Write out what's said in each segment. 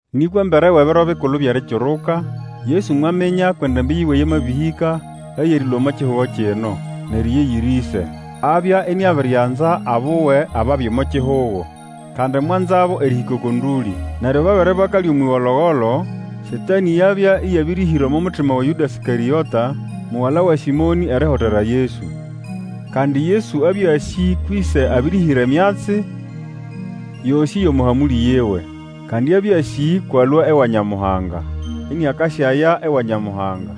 Nĩkwa embere wʼEbiro Bikulu byʼErikiruka, Yesu mwaminya kwʼendambĩ yiwe yamabĩhĩka eyʼerĩlũa omo kihugo kino, nʼeriya eyiri Ĩse. Abya iniabirianza abuwe ababya omo kihugo, kandi mwanzabo erĩhĩka oko ndũlĩ. Neryo babere bakalya omwʼĩgologolo, Satanĩ yabya ĩyabĩrĩhĩra omo mutima wa Yũda Ĩskarĩota mugala wa Sĩmonĩ erihotera Yesu. Kandi Yesu abya asĩ kwʼĨse abĩrĩhĩra emyatsi yosĩ yʼomo hamũlĩ yiwe. Kandi abya asĩ kwʼalũa ewa Nyamuhanga iniakasyaya ewa Nyamuhanga.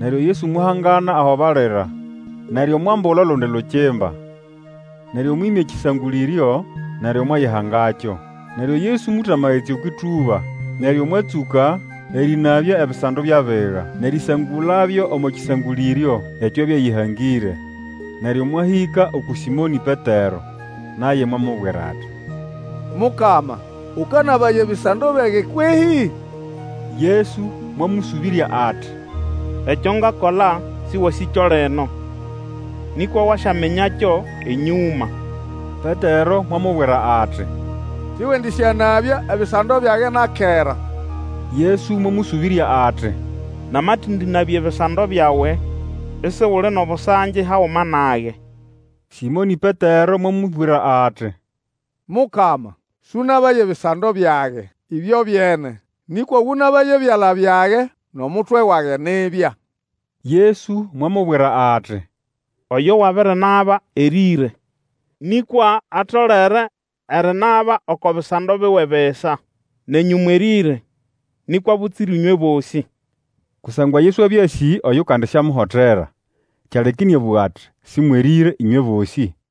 Neryo Yesu mwahangana aho balira. Neryo mwambula olundi lukimba, neryo mwĩmya ekĩsangũlĩryo, neryo mwayihangakyo. Neryo Yesu mũta amagetsi okwʼĩtũba, neryo mwatsũka erĩnabya ebisando byʼabiga, nʼerisangulabyo omo kĩsangũlĩryo ekyo abya ayĩhangĩre. Neryo mwahĩka uku Sĩmonĩ Petero. Naye mwamubwira ati, Mukama, ũkanabaya ebisando byage kwehĩ? Yesu mwamũsũbĩrya ati, Ekyo ngakola sĩwasĩkyo lino, nĩkwa wasyaminyakyo enyũma. Petero mwamubwira ati, Siwendĩsyanabya ebisando byage na kera. Yesu mwamũsũbĩrya ati, Namatendĩnabya ebisando byawe, isuli nʼobusangi haguma nage. Sĩmonĩ Petero mwamubwira ati, Mukama, sũnabaye ebisando byage, ĩbyobyene! Nĩkwa ũnabaye ebyala byage nʼomutwe wage nibya! Yesu mwamubwira ati, Oyo wabirinaba erĩre, nĩkwa atolere erinaba oko bisando biwe bisa. Nenyũ mwerĩre, nĩkwa butsira ĩnywe bosĩ. Kusangwa Yesu abya asĩ oyukandisyamuhotera. Kyaleka ĩnĩabũga ati, Sĩmwerĩre ĩnywe bosĩ.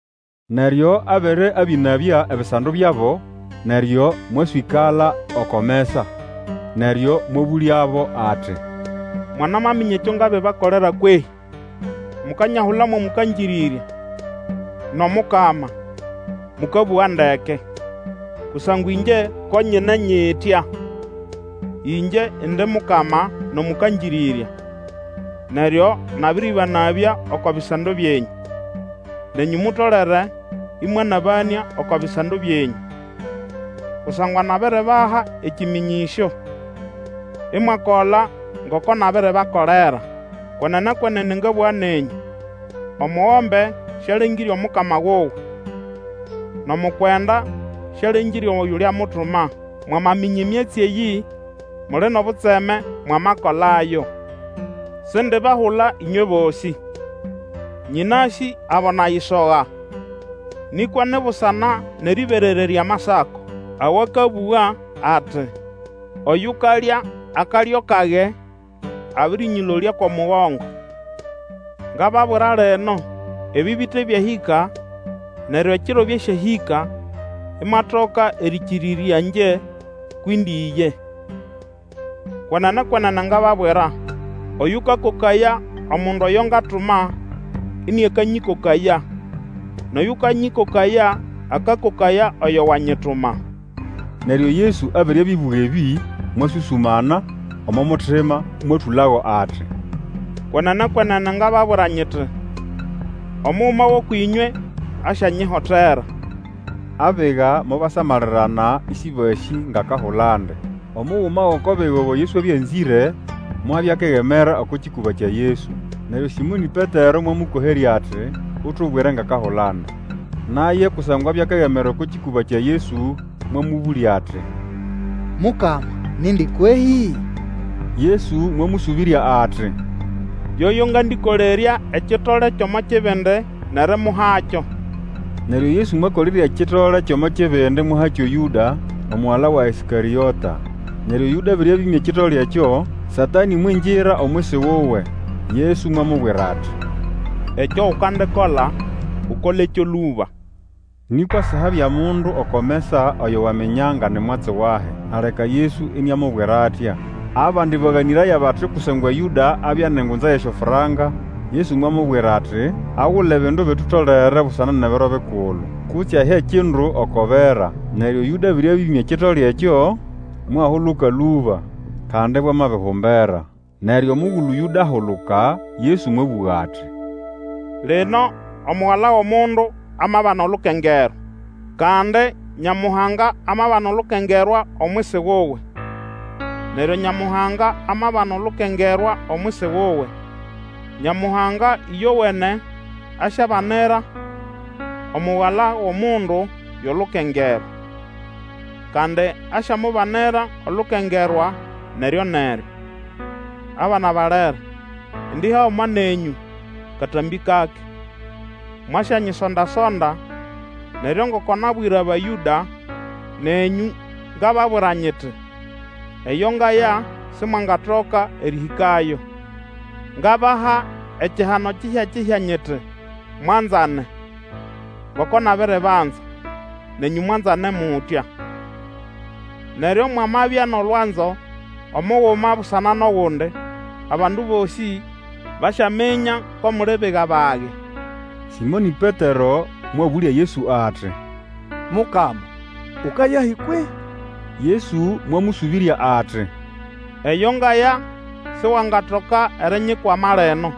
Neryo abere abĩnabya ebisando byabo, neryo mwaswĩkala oko mesa. Neryo mwabũlyabo ati, Mwanamaminya ekyo ngabibakolera kwehĩ? Mukanyahula mo Mũkangĩrĩrya nʼomukama, mũkabũga ndeke, kusangwa ĩngye ko nyine nyitya, ngye indi Mukama nʼOmũkangĩrĩrya, neryo nabĩrĩbanabya oko bisando byenyũ. Nenyũ mutolere ĩmwanabanĩa oko bisando byenyũ. Kusangwa nabiribaha ekĩmĩnyĩsyo, imwakola ngoko nabiribakolera. Kwenene, kwenene ngabũga nenyũ, omugombe sialengĩre omukama wuwe, nʼomukwenda sialengĩre oyuliamutuma. Mwamaminya emyatsi eyĩ, muli nʼobutseme mwamakolayo. Sindibahula ĩnywe bosĩ. Nyĩnasĩ abo nayisoga. Nĩkwa ni busana nʼerĩberererya Amasako, awakabũga ati, Oyukalya akalyo kage, abĩrĩnyĩlolya kʼomugongo. Ngababwira lino, ebĩ bite byahĩka, neryo ekiro byasyahĩka, imwatoka erĩkĩrĩrya ĩngye kwʼindi ye. Kwenene, kwenene ngababwira, oyũkakokaya omundu oyo ngatuma, iniakanyĩkokaya; nʼoyũkanyĩkokaya, akakokaya oyo wanyituma. Neryo Yesu abere abĩbũga ebĩ, mwasũsũmana omo mutima mwatũlago ati, Kwenene, kwenene ngababwira nyiti, Omuguma wʼũkwʼĩnywe asyanyihotera. Abiga mobasamalirana ĩsĩbasĩ ngʼakahulandi. Omuguma gʼoko biga oyo Yesu abya anzĩre mwabya akegemera oko kĩkũba kya Yesu. Neryo Sĩmonĩ Petero mwamũkoherya ati, Utubwire ngʼakahulandi. Naye, kusangwa abya akegemera oko kĩkũba kya Yesu, mwamũbũlya ati, Mukama, nindi kwehĩ? Yesu mwamũsũbĩrya ati, Yoyo ngandĩkolerya ekitole kyʼomo kibindi nʼerimuhakyo. Neryo Yesu mwakolerya ekitole kyʼomo kibindi mwahakyo Yũda, omugala wa Ĩskarĩota. Neryo Yũda abere abĩmya ekitole ekyo, Satanĩ mwingira omwisi wuwe. Yesu mwamubwira ati, Ekyo ukandikola, ukolekyo lũba. Nĩkwa sihabya mundu oko mesa oyo waminya nga ni mwatsi wahi aleka Yesu iniamubwira atya. Abandi baganĩraya bati kusangwa Yũda abya nʼengunza yʼesyofranka, Yesu mwamubwira ati, agule ebindu ebitutolere busana nʼeBiro Bikulu; kutse ahe ekindu oko bera. Neryo Yũda abere abĩĩmya ekitole ekyo, mwahuluka lũba. Kandi ibwamabihumbera. Neryo omugulu Yũda ahuluka, Yesu mwabũga ati, Lino Omugala wʼOmundu amabana olukengerwa, kandi Nyamuhanga amabana olukengerwa omwisi wuwe. Neryo Nyamuhanga amabana olukengerwa omwisi wuwe, Nyamuhanga ĩyowene asyabanira Omugala wʼOmundu yʼolukengerwa. Kandi asyamubanira olukengerwa neryo-neryo. Abana balere, indi haguma nenyũ katambĩ kake. Mwasyanyisonda-sonda, neryo ngoko nabwira Abayũda, nenyũ ngababwira nyiti, Eyo ngaya Simwangatoka erĩhĩkayo. Ngabaha ekihano kihyakihya nyiti, Mwanzane. Ngoko nabiribanza, nenyũ mwanzane mutya. Neryo mwamabya nʼolwanzo, omuguma busana nʼogundi, abandu bosĩ basyaminya ko muli biga bage, Sĩmonĩ Petero mwabũlya Yesu ati, Mukama, ukayahi kwehĩ? Yesu mwamũsũbĩrya ati, Eyo ngaya siwangatoka erinyikwama lino;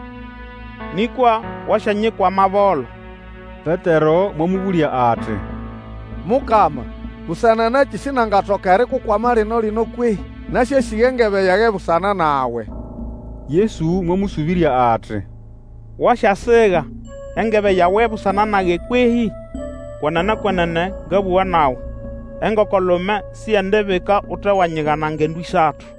nĩkwa wasyanyikwama bolo. Petero mwamũbũlya ati, Mukama, busana nakĩ sinangatoka erikukwama lino-lino kwehĩ? Nasyasiga engebe yage busana nawe. Yesu mwamũsũbĩrya ati, Wasyasiga engebe yawe busana nage kwehĩ? Kwenene, kwenene ngabũga nawe, engoko-lume siyendibika utewanyigana ngendo ĩsatu.